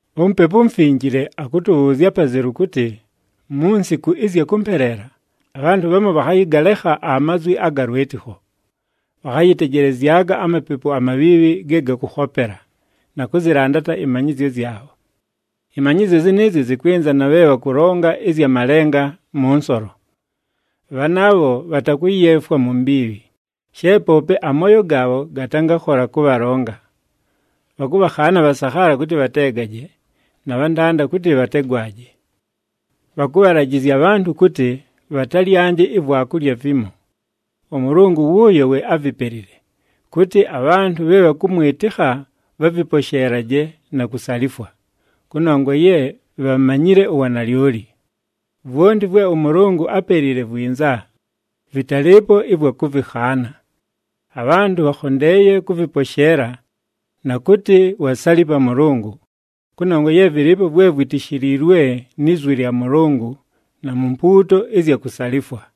UMupepu uMufinjile akʉtʉbhʉʉzya apazelu kʉtɨ, mu nsiku ɨzya kʉmpeleela, abhantʉ bhamu bhakhayɨgalekha amazwi aga lwɨtɨkho. Bhakhayɨtejelezyaga amapepu amabhiibhi ge gakʉkhopela, na kʉzɨlandata ɨmanyɨzyo zyabho. Ɨmanyɨzyo zɨnɨɨzyo zɨkwɨnza na bhe bhakʉlonga ɨzya malenga mʉ nsolo. Bhanaabho, bhatakʉyeefwa mu mbiibhi, she poope amooyo gaabho gatangakhola kʉbhalonga. Bhakʉbhakhaana abhasakhaala kʉtɨ bhateegaje, na bhantanda kʉtɨ bhategwaje. Bhakʉbhalajɨzya abhantʉ kʉtɨ, bhatalyanje ivwakulya vimo. ɄMʉlʉngʉ wʉʉyo we ávipelile, kʉtɨ, abhantʉ bhe bhakʉmwɨtɨkha bhavɨposheelaje na kusalifwa, kʉnongwa ye bhamanyile uwanalyoli. Vwonti vwe ʉMʉlʉngʉ ápelile vwinza, vɨtalɨɨpo ɨvwa kʉvɨkhaana. Abhantʉ bhakhondeeye kʉvɨposheela, na kʉtɨ wasalipa Mʉlʉngʉ, kʉnongwa ye vɨlɨɨpo vwe vwitishiliilwe ni zwi lya Mʉlʉngʉ na mu mpuuto ɨzya kusalifwa.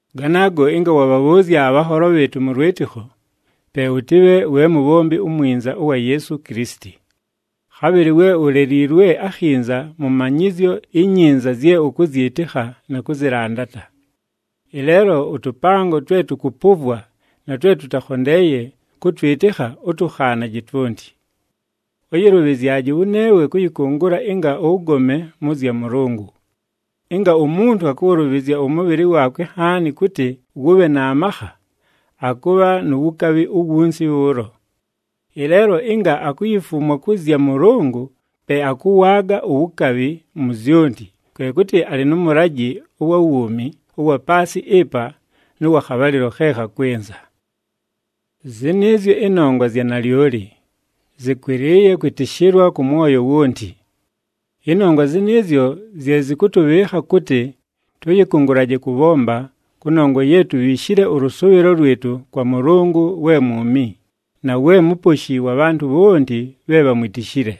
Ganaago, ɨnga wabhabhʉʉzya abhanholo bhɨɨtʉ mʉ lwɨtɨkho, pe ʉtɨbhe we mubhombi umwinza ʉwa Yeesu Kilisiti. Khabhɨlɨ we uleliilwe akhinza mʉ manyɨzyo inyinza zye ʉkʉzyɨtɨkha na kʉzɨlandata. Ɨleelo ʉtʉpango twe tʉkʉpʉvwa na twe tʉtakhondeeye kʉtwɨtɨkha, ʉtʉkhaanaje twonti. Ʉyɨlʉbhɨzyaje wʉneewe kʉyɨkʉngʉla ɨnga ʉgome mʉ zya Mʉlʉngʉ. “Ɨnga umuntu akʉwʉlʉbhɨzya ʉmʉbhɨlɨ waakwe nhaani kʉtɨ wʉbhe na makha, akʉbha nu wukabhi uwunsi bhʉʉlo. Ɨleelo ɨnga akuyifumwa kʉ zya Mʉlʉngʉ, pe akʉwaaga uwukabhi mu zyonti, kwe kʉtɨ alɨ nʉ mʉlajɨ ʉwa wuumi ʉwa paasɨ ɨpa nʉ wa khabhalɨlo khe khakwɨnza.” Zɨnɨɨzyo ɨnongwa zya nalyoli, zɨkwɨlɨɨye kwɨtɨshɨlwa kʉ mwoyo wonti. Ɨnongwa zɨnɨɨzyo zye zɨkʉtʉbhɨɨkha kʉtɨ tʉyɨkʉngʉlaje kʉbhomba, kʉnongwa ye tubhiishile ʉlʉsʉʉbhɨlo lwɨtʉ kwa Mʉlʉngʉ we mwumi, na we Muposhi wa bhantʉ bhonti bhe bhamwitishile.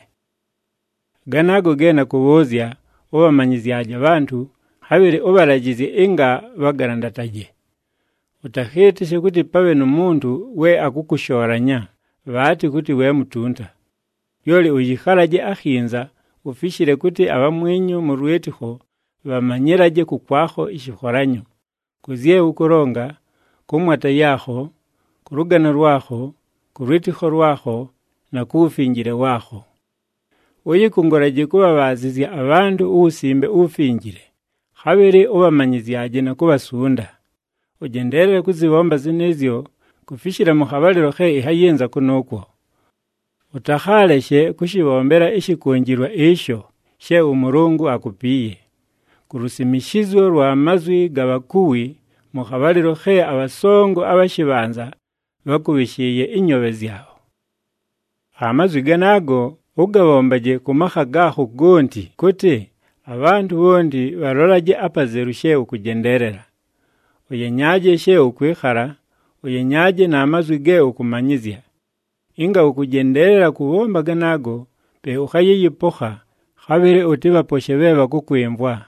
Ganaago ge nakʉbhʉʉzya, ʉbhamanyɨzyaje abhantʉ, khabhɨlɨ ʉbhalajɨzye ɨnga bhagalandataje. Ʉtakhɨɨtɨshe kʉtɨ pabhe nu muntu we akʉkʉshoolanya bhaatɨ kʉtɨ we mutunta. Lyoli ʉyɨkhalaje akhinza, ufishile kʉtɨ abhamwinyu mʉ lwɨtɨkho bhamanyɨlaje kʉkwakho ɨshɨkholanyo, kʉ zye ʉkʉlonga, kʉ mwata yaakho, kʉ lʉgano lwakho, kʉ lwɨtɨkho lwakho, na ku wufinjile waakho. Ʉyɨkʉngʉlaje kʉbhabhaazɨzya abhantʉ uWusimbe uWufinjile, khabhɨlɨ ʉbhamanyɨzyaje na kubhasunda. Ʉjendeelele kʉzɨbhomba zɨnɨɨzyo, kufishila mʉ khabhalɨlo khe ɨnhayɨnza kʉnʉʉkwo. Ʉtakhaaleshe kʉshɨbhombela ɨshɨkʉnjɨlwa ɨsho she ʉMʉlʉngʉ akupiiye, ku lusimishizyo lwa mazwi ga bhakuwi mʉ khabhalɨlo khe abhasongo abha shɨbhanza bhákʉbhɨshɨɨye ɨnyoobhe zyabho. Amazwi ganaago, ʉgabhombaje kʉ makha gaakho gonti kʉtɨ, abhantʉ bhonti bhalolaje apazelu she ʉkʉjendeelela. Ʉyenyaaje she ʉkwɨkhala, ʉyenyaaje na mazwi ge ʉkʉmanyɨzya. Ɨnga ʉkʉjendeelela kʉbhomba ganaago, pe ʉkhayɨyɨpokha, khabhɨlɨ ʉtɨbhaposhe bhe bhakʉkwɨmvwa.